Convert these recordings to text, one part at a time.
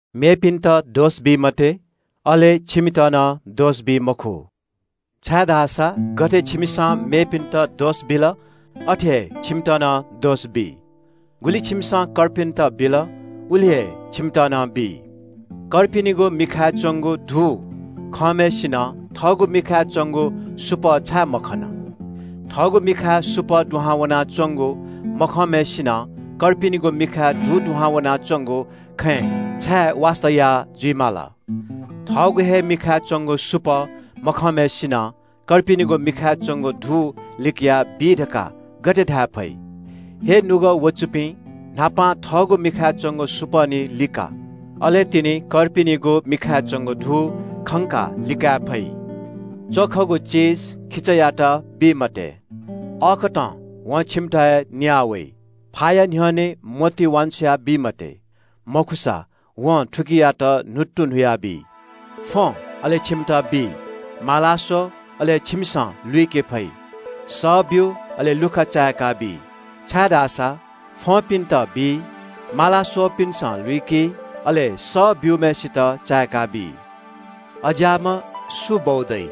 “मेपिन्‍त दोष बी मते, अले छिमित नं दोष बी मखु। छाय्‌धाःसा गथे छिमिसं मेपिन्‍त दोष बिल, अथे हे छिमित नं दोष बी। गुलि छिमिसं कर्पिन्‍त बिल, उलि हे छिमित नं बी। “छिमि किजाया मिखाय् च्‍वंगु धू खंम्‍हय्‌सिनं थःगु मिखाय् च्‍वंगु सुपः छाय् मखन? थःगु मिखाय् सुपः दुहां वनाच्‍वंगु मखंम्‍हय्‌सिनं छिमि किजाया मिखाय् धू दुहां वनाच्‍वंगु खँय् छाय् वास्‍ता याः जुइ माल? थःगु हे मिखाय् च्‍वंगु सुपः मखंम्‍हय्‌सिनं छिमि किजाया मिखाय् च्‍वंगु धू लिकयाबी धकाः गथे धाये फइ? हे निपाः ख्‍वाःपाः दुपिं, न्‍हापां थःगु मिखाय् च्‍वंगु सुपः निं लिका। अले तिनि कर्पिनिगु मिखाय् च्‍वंगु धू खंकाः लिकाये फइ। “च्‍वखगु चिज खिचायात बी मते, अथे याःसा वं छिमित हे न्‍याः वइ। फाया न्‍ह्यःने मोती वान्‍छ्वया बी मते, अथे याःसा वं थुकियात न्‍हुत्तु न्‍हुयाबी। “फ्‍वँ, अले छिमित बी, माला स्‍व, अले छिमिसं लुइके फइ, सः ब्‍यु, अले लुखा चाय्‌काबी। छाय्‌धाःसा फ्‍वंपिन्‍त बी, माला स्‍वःपिन्‍सं लुइकी, अले सः ब्‍यूम्‍हय्‌सित चाय्‌काबी। “अज्‍याःम्‍ह सु बौ दइ?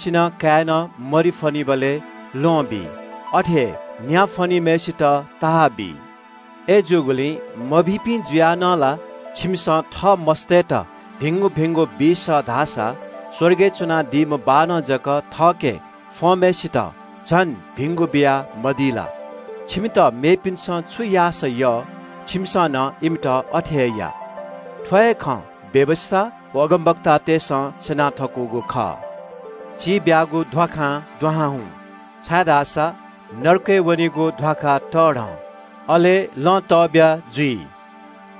सुनां काय्‌नं मरि फ्‍वनीबलय् ल्‍वहं बी? अथे हे न्‍या फ्‍वनीबलय् सर्प बी? मभिंपिं जुयाः नं छिमिसं थः मस्‍तय्‌त भिंगु भिंगु बी सः धाःसा स्‍वर्गय् च्‍वनादीम्‍ह बाःनं जक थःके फ्‍वंम्‍हय्‌सित झन भिंगु बियामदी ला? “छिमित मेपिन्‍सं छु याःसा यः छिमिसं नं इमित अथे हे या। थ्‍व हे खँ व्‍यवस्‍था व अगमवक्तातय्‌सं स्‍यना थकूगु खः। “चिब्‍यागु ध्‍वाखां दुहां हुँ, छाय्‌धाःसा नरकय् वनीगु ध्‍वाखा तब्‍या, अले लँ तब्‍या जुइ।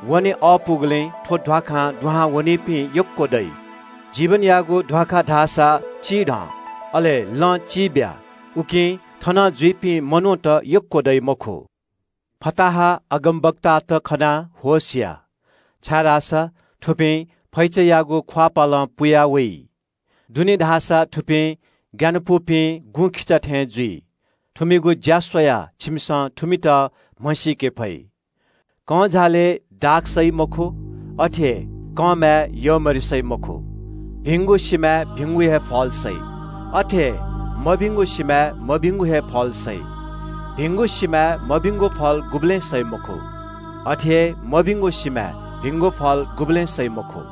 वने अःपुगुलिं थ्‍व ध्‍वाखां दुहां वनीपिं यक्‍व दइ। जीवनयागु ध्‍वाखा धाःसा चिब्‍या, अले लँ चिब्‍या। उकिं थनं जुइपिं मनूत यक्‍व दइ मखु। “फताहा अगमवक्तात खनाः होश या, छाय्‌धाःसा थुपिं फैचायागु ख्‍वाःपालं पुया वइ। दुनें धाःसा थुपिं ग्‍यानापुपिं गुँखिचा थें जुइ। थुमिगु ज्‍या स्‍वयाः छिमिसं थुमित म्‍हसीके फइ। कंझालय् दाख सइ मखु। अथे हे कंमाय् यःमरि सइ मखु। भिंगु सिमाय् भिंगु हे फल सइ। अथे हे मभिंगु सिमाय् मभिंगु हे फल सइ। भिंगु सिमाय् मभिंगु फल गुबलें सइ मखु। अथे हे मभिंगु सिमाय् भिंगु फल गुबलें सइ मखु।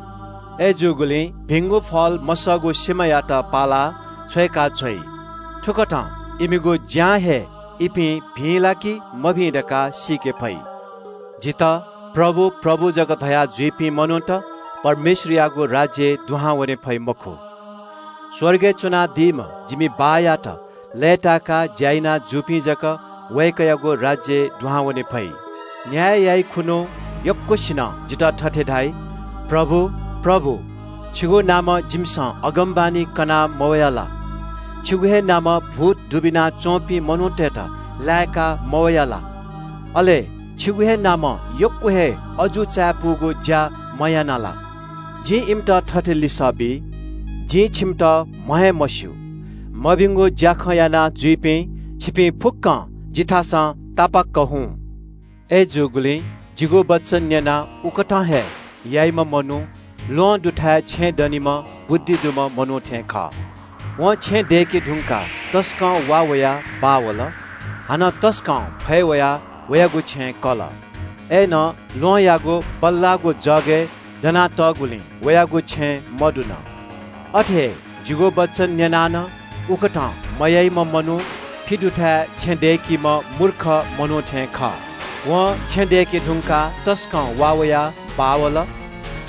अय्‌जूगुलिं भिंगु फल मसःगु सिमायात पालाः छ्वय्‌काछ्वइ। थुकथं इमिगु ज्‍यां हे इपिं भिं ला कि मभिं धकाः सीके फइ। “जितः ‘प्रभु, प्रभु’ जक धयाजुइपिं मनूत परमेश्‍वरयागु राज्‍यय् दुहां वने फइ मखु। स्‍वर्गय् च्‍वनादीम्‍ह जिमि बाःयात लय्‌तायेक ज्‍या याना जूपिं जक वय्‌कःयागु राज्‍यय् दुहां वने फइ। न्‍याय याइखुन्‍हु यक्‍वसिनं जितः थथे धाइ – ‘प्रभु, प्रभु, छिगु नामं जिमिसं अगमवाणी कना मवया ला? छिगु हे नामं भूत दुबिना च्‍वंपिं मनूतय्‌त लाय्‌का मवया ला? अले छिगु हे नामं यक्‍व हे अजू चायापुगु ज्‍या मयाना ला?’ जिं इमित थथे लिसः बी – जिं छिमित म्‍ह हे मस्‍यू। मभिंगु ज्‍याखँ यानाजुइपिं, छिपिं फुक्‍कं जिथासं तापाक्‍क हुँ। “अय्‌जूगुलिं जिगु वचन न्‍यनाः उकथं हे याइम्‍ह मनू ल्‍वहं दुथाय् छेँ दनीम्‍ह बुद्धि दुम्‍ह मनू थें खः। वं छेँ दय्‌के धुंकाः तसकं वा वयाः बाः वल। हानं तसकं फय् वयाः वयागु छेँय् कल। अय्‌नं ल्‍वहंयागु बल्‍लाःगु जगय् दनातःगुलिं वयागु छेँ मदुन। अथे हे जिगु वचन न्‍यनाः नं उकथं मयाइम्‍ह मनू फि दुथाय् छेँ दय्‌कीम्‍ह मूर्ख मनू थें खः। वं छेँ दय्‌के धुंकाः तसकं वा वयाः बाः वल।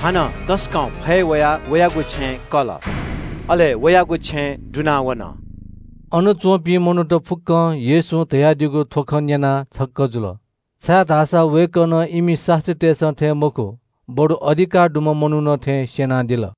हानं तसकं फय् वयाः वयागु छेँय् कल। अले वयागु छेँ दुनावन।” अन च्‍वंपिं मनूत फुक्‍कं येशूं धयादीगु थ्‍व खँ न्‍यनाः छक्‍क जुल। छाय्‌धाःसा वय्‌कलं इमि शास्‍त्रीतय्‌सं थें मखु, बरु अधिकार दुम्‍ह मनुखं थें स्‍यनादिल।